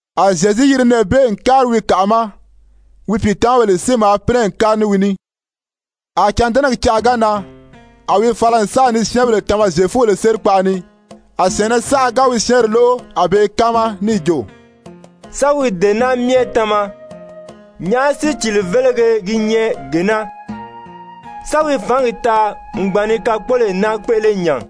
A Zyezu yiri nɛɛ bee n kári wi kàʔa ma. Wi pìitamabèle si maa pínɛ n kári ní wi ní. A cândɛnɛgi canʔa ga nan, a wi fala n sa ni syɛ́ɛnbèle tama Zyefubèle sérikpaʔa ni. A syɛ̀ɛnnɛ saʔa ga wi syɛ́ɛnri lóʔo a be i káama níì jo: «Sán wi dee naa myɛ tama? Nyàʔá sícili-vélege gi nyɛ gee naa? Sán wi fǎngi taa n gbàn ni kakpoloyi naa kpéʔele nya?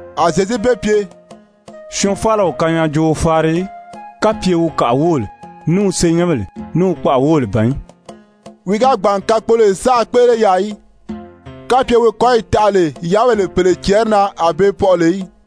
A Zyezu be pye: «Syɔɔn faala o kanyaajooo faari í, kapye wi kàʔa wóbèle, ní wi senyɛnbèle, ní wi kpaʔa wóbèle ban í.» Wi ga gbàn n kakpoloyo saʔa kpéʔele yaà í, kapye wi kɔ́yi taʔa lè yáabèle pèle cɛɛri na a be pɔʔɔ lè í.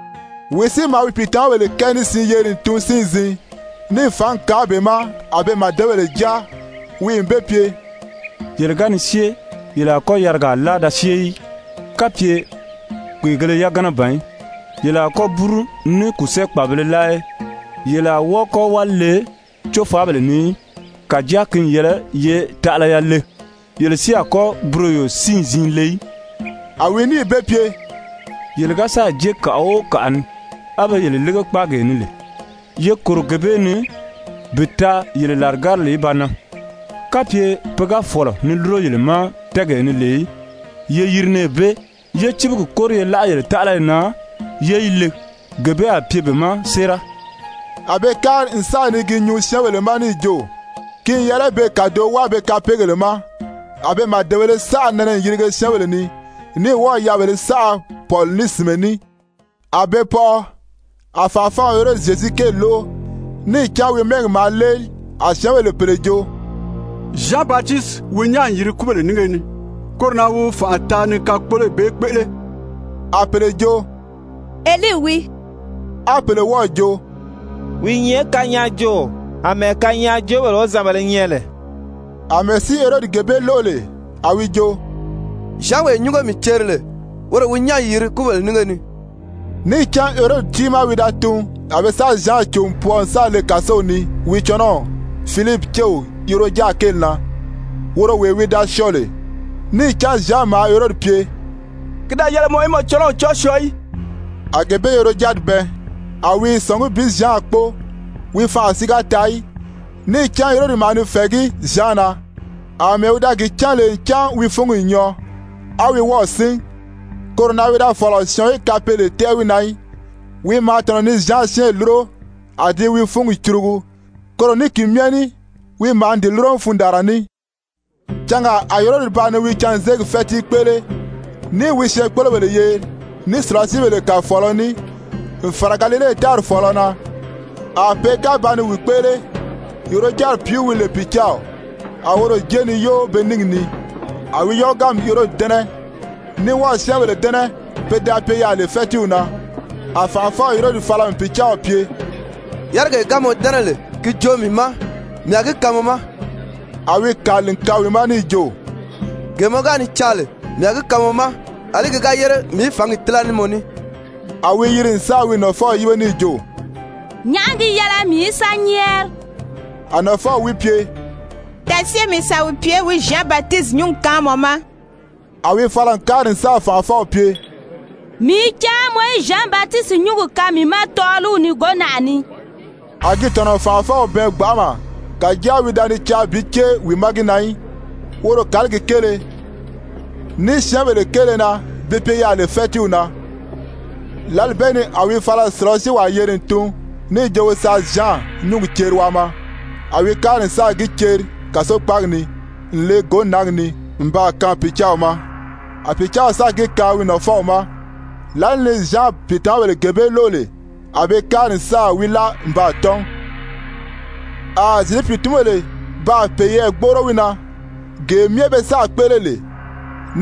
Wi si maa wi pìitamabèle kɛɛ ní siin yeri n tun siin-ziin, níì fǎngi kaan be ma a be màdebèle jáa. Wi n be pye: «Yele ga ni syée yele a kɔ́ yarigaa láa da syée í, kapye kpèegēle yagana ban í. Yele a kɔ́ búru ní kùsɛɛ-kpàbibēle láa í. Yele a wɔ́ɔ kɔ́ wáli le cófaabèle ni í. Kàjáa ki n yɛlɛ ye taʔalaya le, yele si a kɔ́ buroyo siin-ziin le í.» A wi níì be pye: «Yele ga sáà jée kàʔa o kàʔa ni, á be yele lége kpáagee ni lè, ye kòro gee bee ni bi taa yele làrigárili í ba nan. Kapye pe ga fɔ̀lɔ ni lúro yele ma tɛ́ɛgee ni lè í, ye yiri nɛɛ bee, yé cíbigi kóri ye láʔa yele taʔalayi na yé yi le. Gee bee a pye be ma séera.» A be kári n sa ni gi nyuu syɛ́ɛnbèle ma níì jo, ki n yɛlɛ be kàdoʔo wáa be kapeegèle ma. A be màdebēle saʔa nɛnɛ n yirige syɛ́ɛnbèle ni, ní wɔ́ɔ̀ yaabèlē saʔa pɔ̀li ní sìnmɛ ní, a be pɔʔɔ. A fànʔafɔw Herodi Zyezu kéeli lóʔo, níì cán wi mɛ́ɛgi maa léeli. A syɛ́ɛnbèle pèle jo: «Zyan Batisiti wi nyán n yiri kúbèle nínge ni, koro na wi fànʔa taa ni kakpoloyi bee kpéʔele.» A pèle jo: «Elii wii.» A pèle wɔ́ɔ̀ jo: «Wi i nyɛ kanyaajooo àmɛɛ kanyaajoobèle wozanbèlē nyɛ lè.» Amɛɛ si Herodi gee bee lóʔo lè, a wi jo: «Zyanwee nyúngo mii ceri lè, woro wi nyán n yiri kúbèle nínge ni.» Níì cán Herodi tiimaa wi da tun, a be sáà Zyan cò n pwɔɔ n sáà le kàsow ni wi cɔnɔw Filipi céw Herojadi kéeli na, woro wee wi da syɔɔ lè. Níì cán Zyan maa Herodi pye: «Ki da yɛlɛ mɔ í mɔ cɔnɔw cɔ́ɔ syɔɔ í.» A gee bee Herojadi bɛɛn, a wi i sɔ̀ngí bi Zyan kpóo. Wi fanʔa si ga taa í. Níì cán Herodi maa ni fɛ̀ɛgí Zyan na, àmɛɛ wi da gi cán lè ncan wi fúngi n nyɔɔ, a wi wɔ́ɔ̀ sín. Koro na wi da fɔ̀lɔ syɔɔn í kapeele tɛ́ʔɛ wi na í, wi maa tɔ̀nɔ ni Zyan syɛ́ɛnri lúro, a di i wi fúngi curugu. Koro ní ki myɛ ní wi maa ni di lúro ní fundaanra ní. Cangaa a Herodi ba ni wi canzeegi fɛ́tii kpéʔele, níì wi syɛɛnkpolobèle yeri ní sùlasiibèle kàfɔɔlɔ ní, n fàra Galile tári fɔ̀ɔlɔ na. A pe ga ba ni wi kpéʔele, Herojadi pìíw wi lè pìcaaw, a woro jée ni yóo be níngi ni. A wi yɔ́ɔganmi Herodi dɛ́nɛ ní wɔ́ɔ̀ syɛ́ɛnbèle dɛ́nɛ pe da pye yaà lè fɛ́tiiw na. A fànʔafɔw Herodi fala n pìcaaw pye: «Yárigee ga mɔ dɛ́nɛ lè, ki joo mii ma, mii a gi kaan mɔ ma.» A wi kàli n kaan wi ma níì jo: «Gee mɔ ga ni caa lè, mii a gi kaan mɔ ma, àlí ki ga yére mii í fǎngi tíla ní mɔ ní.» A wi yiri n sáà wi nafɔw yíbe níì jo: «Nyàʔá gi yɛlɛ mii í sa nyɛ́ɛri?» A nafɔw wi pye: «Da syée mi sa wi pye wi Zyan Batisiti nyúngi kaan mɔ ma.» A wi fala n kári n sáà fànʔafɔw pye: «Mii i caa mɔ í Zyan Batisiti nyúngi kaan mii ma tɔ́ɔliw ni gǒnaʔa ni.» A gi tɔ̀nɔ n fànʔafɔw bɛɛn gbanʔama, kàjáa wi da ni caa bi cée wi ma gi na í woro kàligi kéele, ní syɛ́ɛnbèle kéele na be pye yaà lè fɛ́tiiw na. Lǎli bee ni a wi fala n sùlasiiwaa yeri n tun níì jo wi sa Zyan nyúngi ceri waa maa, a wi kári n sáà gi ceri kàsokpaagi ni n le gǒnaagi ni n baa kaan pìcaaw ma. A pìcaaw sáà gi kaan wi nafɔw ma. Lǎli ni Zyan pìitamabèle gee bee lóʔo lè, a be kári n sáà wi láa n baa tɔ́n. A Zyezu pìitunbèle baa peyɛɛ gbóʔoro wi na, gee myɛ be sáà kpéʔele lè,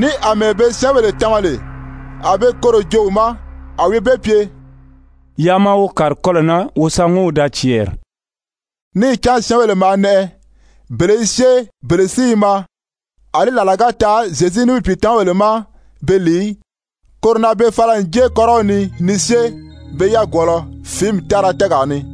ní àmɛɛ be syɛ́ɛnbèle tama lè, a be koro joo wi ma. A wi be pye: «Yaa maa wo kàri kɔlɔ̀ na wo sa ŋɔ́n wo daa cɛɛri.» Níì cán syɛ́ɛnbèle maa nɛʔɛ, bele i syée, bele si i maa, àlí làla ga taa Zyezu ní wi pìitamabèle ma be lìi í. Koro na be fala n jée kɔ́rɔw ni ni syée pe yagwɔɔlɔ fìími tára tɛ́ɛgaa ni.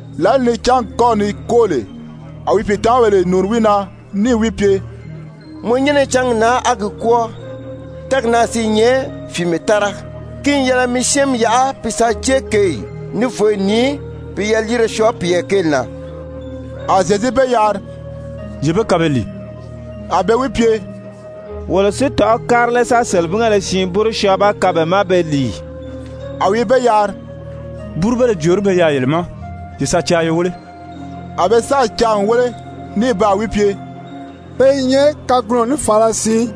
Lǎli ni cángi kɔ́ ni kwóo lè, a wi pìitamabèle nùuni wi na níì wi pye: «Mɔ nyɛ́nɛ i cángi na á gi kwɔ́ɔ, tɛ́ɛgi naa si i nyɛ fìimɛ tára. Ki n yɛlɛ mi syɛ́ɛnmi yaʔa bi sa jée kěyi, ní vǒyi ni, bi yaliire syɔɔ piyɛɛ kéeli na.» A Zyezu be yari: «Ye be kaan be lìi.» A be wi pye: «Wolo si tɔ̀ʔɔ́ kári lé sa selebingéle siin búru syɔɔ ba kaan be ma be lìi?» A wi be yari: «Búrubéle jòorí be yaà yele ma? Ye sa caa ye wéle.» A be sáà caa n wéle, ní baa wi pye: «Pe i nyɛ kagunɔ ní fàāla siin.»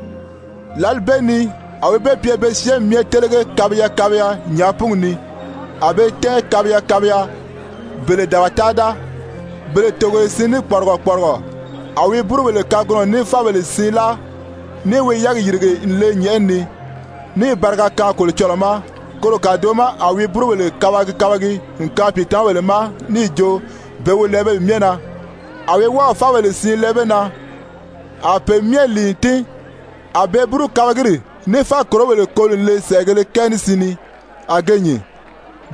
Lǎli bee ni a wi be pye be syɛ́ɛnmi myɛ télege kabiya kabiya nyàápungi ni. A be tɛ́ɛn kabiya kabiya, bele dabata-da, bele togoye siin ní kpɔrigɔ kpɔrigɔ. A wi búrubèle kagunɔ ní fábèle siin láa, níì wi yɛ́ɛgi yìrige n le nyɛ̀ʔɛni ni, níì bariga kaan Kolocɔlɔɔ ma. Koro kàdoʔo ma a wi búrubèle kabagi kabagi n kaan pìitamabèle ma níì jo be wi lɛɛ pe myɛ na. A wi wɔ́ɔ̀ fábèle siin lɛɛ be na. A pe myɛ lìi n tín. A be búru-kabagiri ní fákorobèle koli n le sɛ̀ʔɛgēle kɛɛ ní siin ni, a ge nyìn.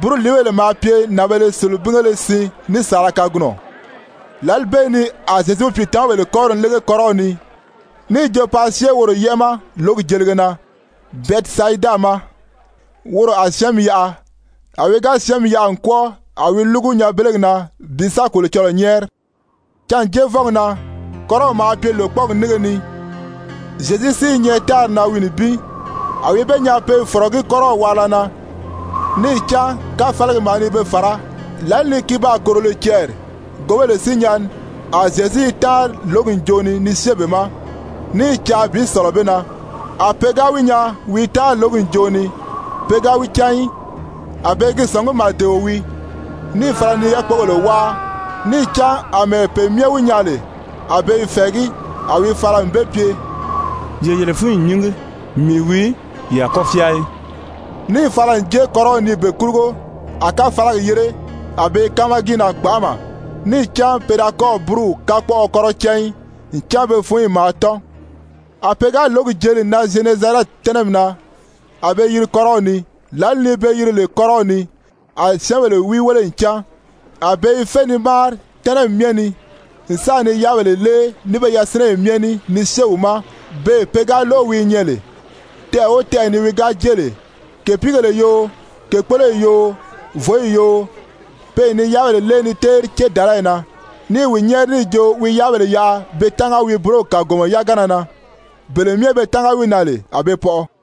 Búruliibèle maa pye nànbēle selebingéle siin ní saala kagunɔ. Lǎli bee ni a Zyezu wi pìitamabèle kɔ́ri n lége kɔ́rɔw ni, níì jo paa syée woro yɛ́ʔɛ ma lǒgi jelige na Bɛtisayida ma, woro a syɛ́ɛnmi yaʔa. A wi ga syɛ́ɛnmi yaʔa n kwɔ́ɔ, a wi lúgu nyanbelegi na bi sa Kolocɔlɔɔ nyɛ́ɛri. Cânjeevɔngi na kɔ́rɔw maa pye lòkpɔɔgi nínge ni, Zyezu si i nyɛ tári na wi nibin. A wi be nyaa pe i fɔ̀rɔgí kɔ́rɔw waarila na, níì cán káfalagi maa ni be fàrá. Lǎli ni ki baa kòro lè cɛɛri gǒbèle si nyɛni, a Zyezu i táanri lǒgi ǹjoʔo ni ni syée be ma, ní i caa bi sɔ̀lɔ be na. A pe ga wi nyaa wi i táanri lǒgi ǹjoʔo ni, pe ga wi cán í, a be i gi sɔ̀ngí màdeo wii, níì fala ni yákpogèle wáa. Níì cán àmɛɛ pe myɛ wi nyaa lè, a be i fɛ̀ɛgí. A wi fala n be pye: «Ye yele fúnyi nyíngi, mii wii, ye a kɔ́ fyáa í.» Níì fala n jée kɔ́rɔw ni be kurugo, a káfalagi yére. A be i káama gi na gbanʔama. Níì cán pe da kɔ́ɔ̀ búruw kakpɔʔɔ kɔ́rɔ cán í, ncan be fúnyi maa tɔ́n. A pe ga lǒgi jeli n nan Zyenezarɛti tɛ́nɛmi na a be yiri kɔ́rɔw ni. Lǎli ni be yiri lè kɔ́rɔw ni, a syɛ́ɛnbèle wi wéle n cán. A be i fé ni máari tɛ́nɛmi myɛ ni n sa ni yáabèle lée ní be yasinɛyi myɛ ní ni syée wi ma beè pe ga lóʔo wi i nyɛ lè. Tɛʔɛ o tɛʔɛ ni wi ga jée lè, kèpiigèle yoo, kèkpoloyi yoo, vǒyi yoo, pe n ni yáabèle lée ni téeri cédalayi na, ní i wi nyɛ́ɛri níì jo wi yáabèle yaʔa be tánga wi búrogi kàgomɔ yagana na. Bele myɛ be tánga wi na lè, a be pɔʔɔ.